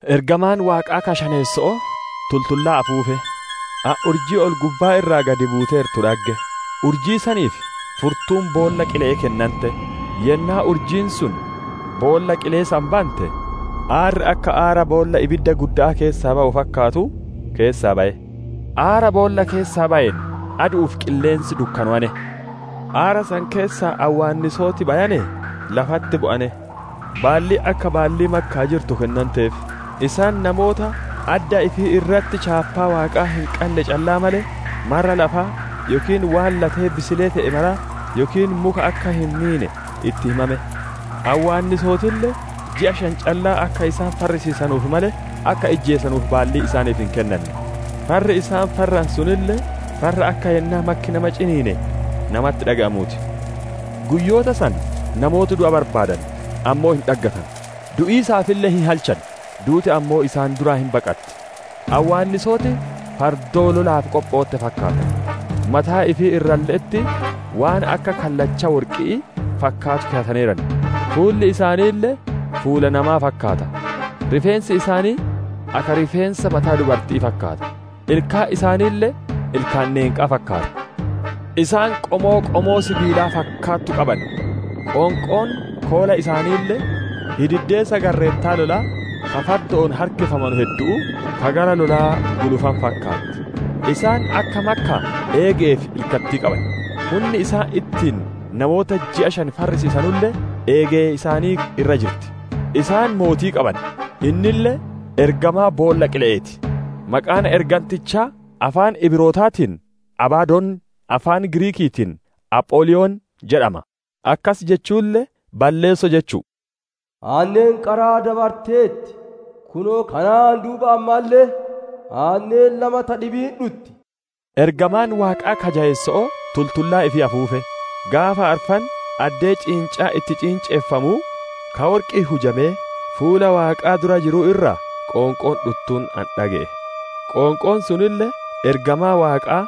Ergamaan Waaqaa ka shaneesso'oo tultullaa afuufe. Ani urjii ol-gubbaa irraa gadi buuteertu dhagge; urjii saniif furtuun boolla qile'ee kennante. Yennaa urjiin sun boolla qilee san bante, aarri akka aara boolla ibiddaa guddaa keessaa bawu fakkaatu keessaa baye. Aara boolla keessaa bayeen, adu'uu fi qilleensi dukkanowane. Aara san keessaa awwaannisooti bayanee lafatti bu'ane; baalliin akka baallii makkaa jirtu kennanteef. Isaan namoota adda ifii irratti chaappaa Waaqaa hin qanne callaa malee, marra lafaa, yookiin waan latee bisilee te'e mara, yookiin muka akka hin miine itti himame. Awwaannisootille ji'a shan callaa akka isaan farrisiisanuuf malee, akka ijjeesanuuf baalliin isaaniif hin kennanne; farri isaan farranu sunille farra akka yennaa makki nama ciniine namatti dhage'amuu ti. Guyyoota san namooti du'a barbaadan, ammoo hin dhaggatanu; du'iisaafille hin halchan, duuti ammoo isaan duraa hin baqatti. Awwaannisooti fardoo lolaaf qophootte fakkaatan; mataa ifii irralle'etti waan akka kallacha worqi'ii fakkaatu keyataneeran; fuulli isaaniille fuula namaa fakkaata; rifeensi isaanii akka rifeensa mataa dubarti'ii fakkaata; ilkaan isaaniille ilkaan neenqaa fakkaata. Isaan qomoo, qomoo sibiilaa fakkaattu qaban; qoonqoon koola isaaniille hididdeessa garreettota lolaa ka fardo'oon harkifamanu heddu'uu, ka gara lolaa gulufanuu fakkaatti. Isaan akka makkaa eege'ee fi ilkattii qaban. Hunni isaan ittiin namoota ji'a shan farrisiisanulle eegee isaanii irra jirti. Isaan mootii qaban; innille ergamaa boolla qile'eeti; maqaan ergantichaa afaan Ibrootaatiin, «Abadoon», afaan Giriikiitiin, «Apholiyon» jedhama; akkas jechuulle, «Balleesso» jechu'u. Aanneen qaraa dabarteerti; kunoo kanaan duuba ammalle aanneen lama ta dhibiin hin dhutti. Ergamaan Waaqaa ka jayeesso'oo tultullaa ifii afuufe. Gaafa arfan addee ciincaan itti ciinceffamuu, ka worqi'iin hujamee fuula Waaqaa dura jiruu irraa qoonqoon dhuttuun ani dhage'e. Qoonqoon sunille ergamaa Waaqaa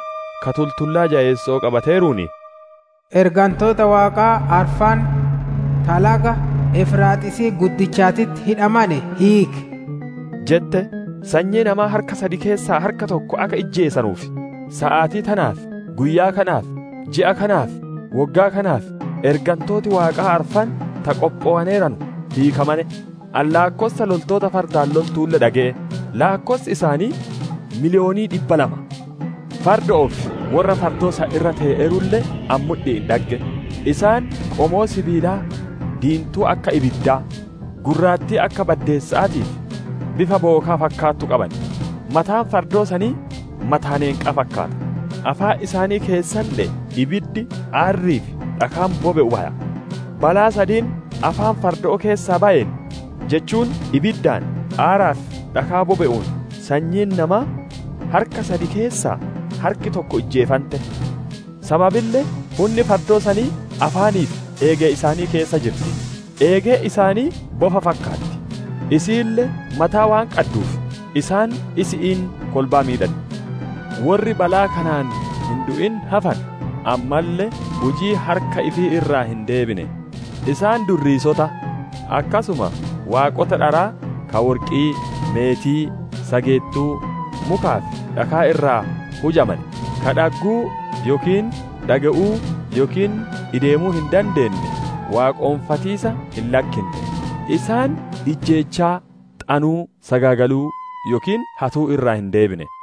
ka tultullaa jayeesso'oo qabateeruun, «Ergantoota Waaqaa arfan ta laga Efraaxiisii guddichaatitti hidhamane hiiki!» jette. Sanyii namaa harka sad keessaa harka tokko akka ijjeesanuuf, saatii tanaaf, guyyaa kanaaf, ji'aa kanaa fi woggaa kanaaf, ergantooti Waaqaa arfan ta qophowaneeranu hiikamane. Ani laakkossa loltoota fardaan loltuulle dhage'e; laakkossi isaanii miliyoonii dhibba lama. Fardo'oo fi worra fardoo san irra tee'eerulle ani mudhi'iin dhagge. Isaan qomoo sibiilaa diintuu akka ibiddaa, gurraattii akka baddeessa'aatii, fi bifa bookaa fakkaattu qaban. Mataan fardoo sanii mataa neenqaa fakkaata; afaan isaanii keessalle'ee ibiddi, aarrii fi dhakaan bobe'u baya. Balaa sadiin afaan fardo'oo keessaa bayeen, jechuun ibiddaan, aaraa fi dhakaa bobe'uun sanyiin namaa harka sad keessaa harki tokko ijjeefante. Sababille hunni fardoo sanii afaanii fi eegee isaanii keessa jirti; eegeen isaanii bofa fakkaatti; isiille mataa waan qadduuf, isaan isi'iin kolbaa miidhan. Worri balaa kanaan hin du'in hafane ammalle hujii harka ifii irraa hin deebine. Isaan durriisota, akkasuma waaqota dharaa ka worqii, meetii, sageettuu, mukaa fi dhakaa irraa hujamane, ka dhagguu, yookiin dhage'uu, yookiin ideemuu hin dandeenne waaqonfatiisa hin lakkinne. Isaan ijjeechaa, xanuu, sagaagaluu yookiin hatuu irraa hin deebine.